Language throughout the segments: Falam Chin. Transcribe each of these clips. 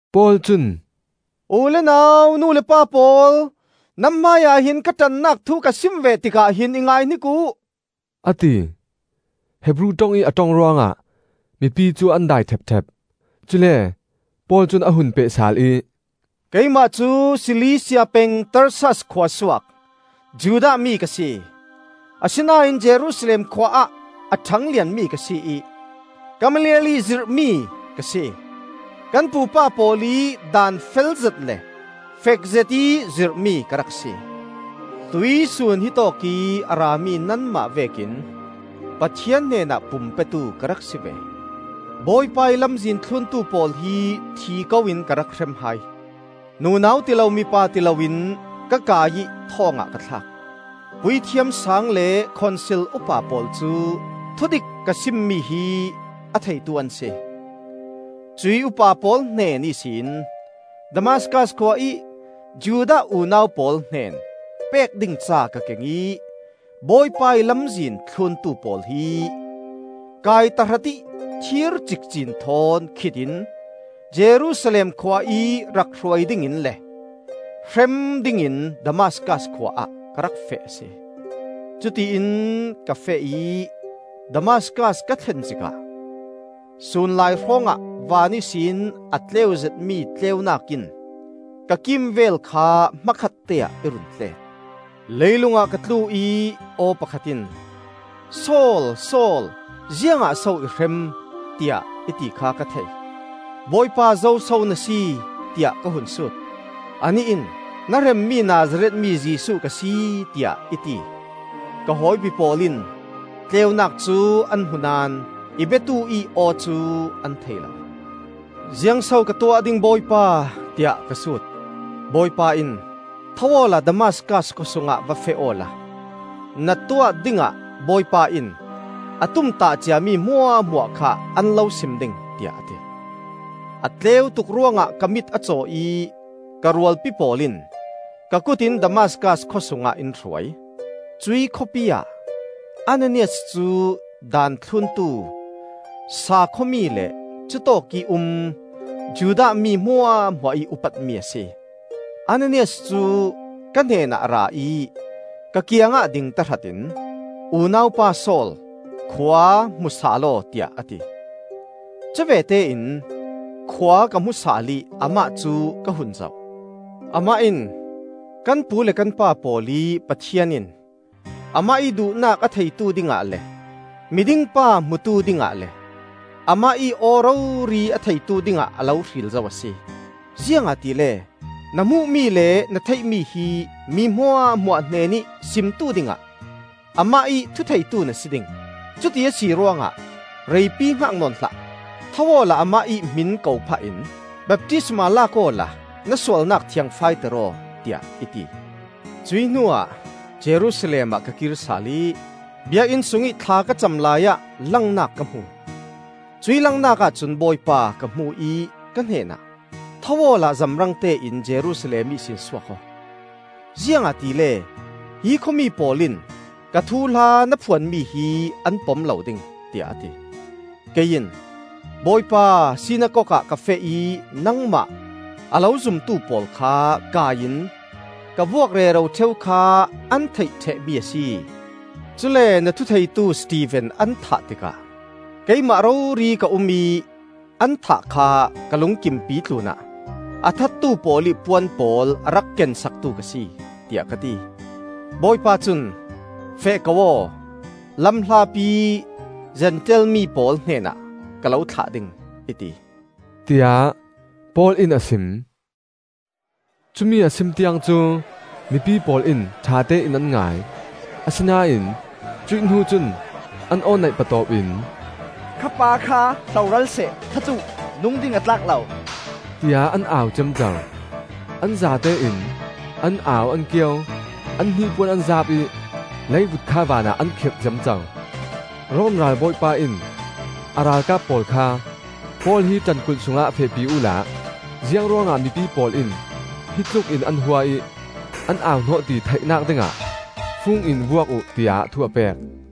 Paul cun, “U le nau, nu le pa pawl, nan hmaiah hin ka ṭannak thu ka sim ve tikah hin i ngaihnik uh!” a ti. Hebru ṭong ih a ṭong ruangah mipi cu an dai ṭhepṭhep. Cule Paul cun a hun peh sal ih: “Keimah cu Silisia peng Tarsas khua suak Judah mi ka si. Asinain Jerusalem khua ah a ṭhanglian mi ka si ih Gamaliel ih zirhmi ka si. Kan pupa pawl ih daan felzet le fekzet ih zirhmi ka rak si. Tuihsun hitawk ih a rami nanmah vekin Pathian hnenah pum petu ka rak si ve. Bawipa ih Lamzin thluntu pawl hi thi ko in ka rak hrem hai. Nunau tilo, mipa tilo in ka kai ih thawngah ka thlak. Puithiam Saang le Khonsil upa pawl cu thudik ka simmi hi a theitu an si. Cuih upa pawl hnen ihsin Damaskas khua ih Judah unau pawl hnen pek ding ca ka keng ih Bawipa ih Lamzin thluntu pawl hi kai tahratih thir cikcin thawn khit in Jerusalem khua ih rak hruai dingin le hrem dingin Damaskas khua ah ka rak feh a si. “Cutiin ka feh ih Damaskas ka thlen zikah, sunlai hrawngah van ihsin a tleuzetmi tleunak in ka kimvel kha hmakhatte ah i run tlet. Leilung ah ka tlu ih aw pakhat in, ‘Saul, Saul, ziangah so i hrem?’ tiah i ti kha ka thei. ‘Bawipa, zoso na si?’ tiah ka hun sut. Anih in, ‘Na hremmi Nazareth mi Jesuh ka si,’ tiah i ti. Ka hawipi pawl in tleunak cu an hmu naón i biatu-ih aw cu an thei lo. ‘Ziang so ka tuah ding, Bawipa?’ tiah ka sut. Bawipa in, ‘Tho awla Damaskas khawsungah va feh awla na tuah dingah Bawipa in a tumtah ciami hmuahhmuah kha an lo sim ding,’ tiah a ti. A tleu tuk ruangah ka mit a caw ih ka rualpi pawl in ka kutin Damaskas khawsungah in hruai. Cuih khawpi ah Ananias cu daan thluntu saakhua-mi le cutawk ih um Judah mi hmuahhmuah ih upatmi a si. Ananias cu ka hnenah a ra ih ka kiangah ding tahratin, ‘Unau pa Saul, khua hmu sal aw,’ tiah a ti. Cuvete in khua ka hmu sal ih amah cu ka hun zoh. Amah in, ‘Kan pu le kan pa pawl ih Pathian in amah ih duhnak a theitu dingah le Miding pa hmutu dingah le amah ih aw rori a theitu dingah a lo hril zo a si. Ziangahtile na hmuhmi le na theihmi hi mi hmuahhmuah hnenih simtu dingah Amah ih thutheitu na si ding. Cuti a si ruangah reipi hngak nawn hlah! Tho awla amah ih hmin ko phah in baptisma lak awla na sualnak thiangfaiter aw,” tiah i ti. “Cuih hnuah Jerusalem ah ka kirsal ih Biakinn sungih thla ka cam laiah langnak ka hmu. Cuih langnak ahcun Bawipa ka hmu ih ka hnenah, ‘Tho awla zamrangte in Jerusalem ihsin suak aw, ziangahtile hi khuami pawl in ka thuhla na phuanmi hi an pom lo ding,’ tiah a ti. Kei in, ‘Bawipa, sinakok ah ka feh ih nangmah a lo zumtu pawl kha kai in ka vuak rero ṭheu kha an theih ṭhehmi a si. Cule na thutheitu Stefen an thah tikah keimah rori ka um ih an thah kha ka lungkimpi tlunah a thattu pawl ih puan pawl a rak kensaktu ka si,’ tiah ka ti. Bawipa cun, ‘Feh ko aw; lam hlapi Zentail mi pawl hnenah ka lo thlah ding,’ i ti,” tiah Paul in a sim. Cumi a sim tiang cu mipi pawl in ṭhatein an ngai. Asinain cuih hnu cun an aw neih patawp in, “Kha pa kha hloral seh! That uh! Nung ding a tlak lo!” tiah an au ciamco. An zatein an au, an kio, an hnipuan an zaap ih leivut kha vanah an khirh ciamco. Rom ralbawipa in a ralkap pawl kha Paul hi ṭankulh sungah fehpi uhla ziang ruangah mipi pawl in hitlukin an hua ih an au hnawh ti theihnak dingah fung in vuak uh, tiah thu a pek.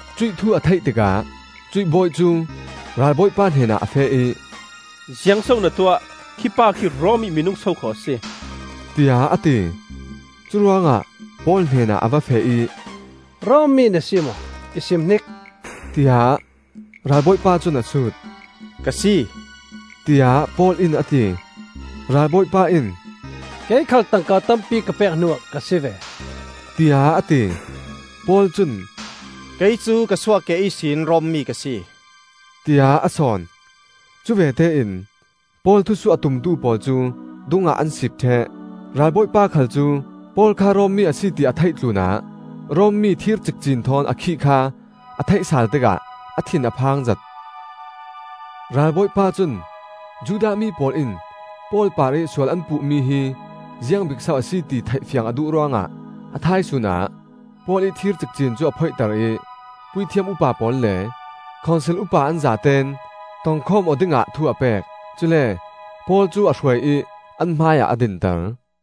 Cuih thu a theih tikah cuih bawi cu ralbawipa hnenah a feh ih, “Ziang so na tuah? Khi pa khi Rom ih minung sokhaw a si!” tiah a ti. Curuangah Paul hnenah a va feh ih, “Rom mi na si maw? I sim hnik?” tiah ralbawipa cun a sut. “Ka si,” tiah Paul in a ti. Ralbawipa in, “Kei khal tangka tampi ka pek hnuah ka si ve,” tiah a ti. Paul cun, “Kei cu ka suahkeh ihsin Rom mi ka si,” tiah a sawn. Cuvete in Paul thusuh a tumtu pawl cu dungah an siip ṭheh. Ralbawipa khal cu Paul kha Rom mi a si ti a theih tlunah Rom mi thir cikcin thawn a khih kha a theih sal tikah a thin a phangzet. Ralbawipa cun Judah mi pawl in Paul parih sual an puhmi hi ziang bik so a si, ti theihfiang a duh ruangah a thaisun ah Paul ih thir cikcin cu a phoihter ih Puithiam upa pawl le Khonsil upa an zatein tongkhawm aw dingah thu a pek. Cule Paul cu a hruai ih an hmaiah a dinter.